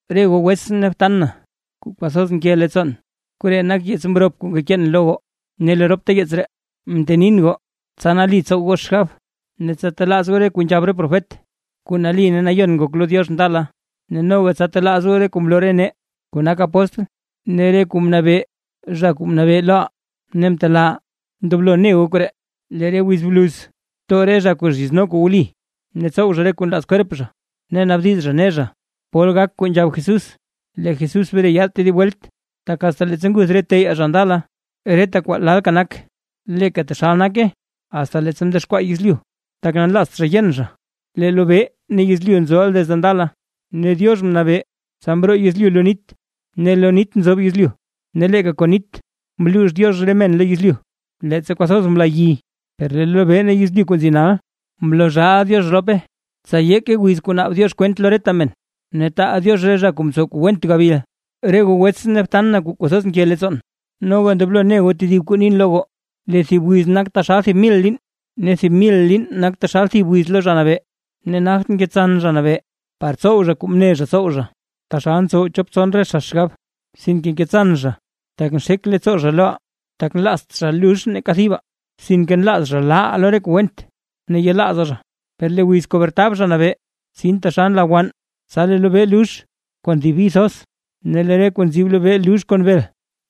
Re goo wetsʼn ne btan na kuu kwathoz nke leettsoon, koree nak yeets mrop kuu ngekeen lo goo. Ne lo ropta yeets ree, mtenin goo, tsa nali tsow goo xgab. Ne tsa telaaz goo re kuu nzhab re profet kuu nali ne nayon ngok lo Diox ndala; noga tsa telaaz goo re kuu mloo re nee kuu nak apóstl, ne re kuu mnabee Zha Kuu Nabee loʼaa ne mtelaaʼaa. Ndoblo ne goo koree: Lee re wiz bluz too re zha kuu zhizno kuu wli, ne tsow zha re kuu nlaaz kwerp zha. Ne naabdiz zha ne zha: “¿Pol gak kuu nzhab Jesús, lee Jesús bre yaad tedib welt? Tak asta leettsa nguth re teyaa zha ndala, reta kwaa lalka nak, leeka taxal nake asta leettsa mdexkwaa yezlyu.” Tak nlaazt zha yen zha lee lobee ne lee yezlyu nzoʼa desde ndala, ne Diox mnabee tsa mroo yezlyu lo nit, ne lo nit nzoob yezlyu. Ne leeka kon nit mluux Diox re men lo yezlyu, leettsa kwathoz mla yi. Per lee lobee ne yezlyu kuu nzi nal, mloo zhaaʼa Diox rope tsa yeeke wiz kuu naab Diox kwent lo reta men, ne taal Diox re zha kuu mtsow kuu went gabil. Re goo wetsʼn ne btan na kuu kwathoz nke leettsoon, noga ndoblo ne goo tedib kuu nin lo goo, lee thib wiz nak taxal thib mil liin ne thib mil liin nak taxal thib wiz lo Zha Nabee. Ne nagt ngetsan Zha Nabee par tsow zha kuu mne zha tsow zha, taxal ntsow chop tson re zha xgab, sinke ngetsan zha tak nxek leettsoo zha loʼaa, tak nlaazt zha lux neeka thibaa, sinke nlaaz zha laaʼaa re kuu went ne yelaazaa zha. Per lee wiz kuu bretab Zha Nabee tsin taxal nla wann; tsa lee lobee lux kon thib bi thoz, ne lee re kuu nzib lobee lux kon bel,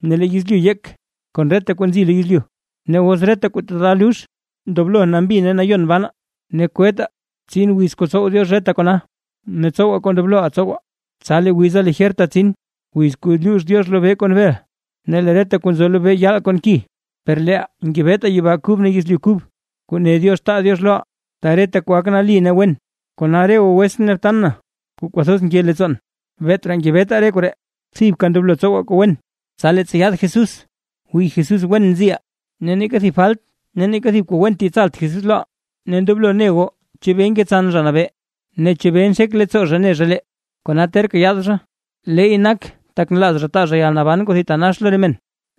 ne lee yezlyu yek kon reta kuu nzi lo yezlyu. Ne os reta kuu tata lux, ¡ndoblo nambi ne nayon banaa! Ne kwettaa tsin wiz kuu tsow Diox reta kona ne tsowaa kuu ndobloʼaa tsowaa tsa lee wiza lijerta tsin. Wiz kuu luux Diox lobee kon bel ne lee reta kuu nzo lobee yaal kon ki; per leeʼaa ngebetaa yibaa kub ne yezlyu kub, kuu ne Diox taa Diox loʼaa, ta reta kwaa gak nali ne wen. Kona, re goo wetsʼn ne btan na kuu kwathoz nke leettsoon, beet raa ngebetaa re koree, thibka ndoblo tsowaa kuu wen, tsa leettsa yaad Jesús wii Jesús wen nziʼaa, ne neeka thib falt ne neeka thib kuu went yetsalt Jesús loʼaa. Ne ndoblo ne goo chebee ngetsan Zha Nabee ne chebee nxek leettsoo zha ne zha lee, kona terka yaad zha, leey nak tak nlaaz zha taa zha yalnaban kuu thitanax lo re men.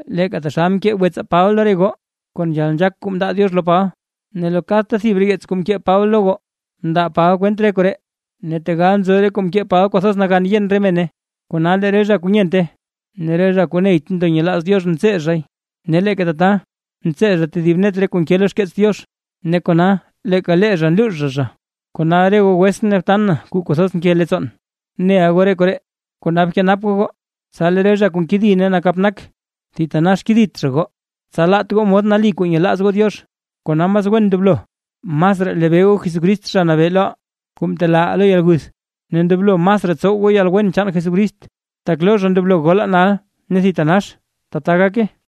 Leeka taxal mkee wetsaa Paba lo re goo, kon yalnzhaak kuu mndaa Diox lo Paba, ne lo kadta thib re yeets kuu mkee Paba lo goo mndaa Paba kwent re koree, ne tegal nzo kuu mkee Paba kwathoz nagan yen re mene, kona lee re zha kuu nyente ne re zha kuu neyt ndo nyelaaz Diox ntsee zhay, ne leeka tata ntsee zha tedib net re kuu nke lo xkeets Diox, ne kona leeka lee zha nluux zha zha. Kona re goo wetsʼn ne btan na kuu kwathoz nke leettsoon, neʼa goo re koree, kona bkenap goo goo, tsa lee re zha kuu nkedi ne nakap nak thitanax kedit zha goo, ne tsa laat goo mod nali kuu nyelaaz goo Diox. Kona mas wen ndoblo masraa lebee goo Jesucrist Zha Nabee loʼaa, kuu mtelaaʼaa lo yalguth, ne ndoblo masraa tsow goo yalwen chaan Jesucrist. ¡Tak lo zha ndoblo golaa nal ne thitanax! ¡Tbaa gake! Pey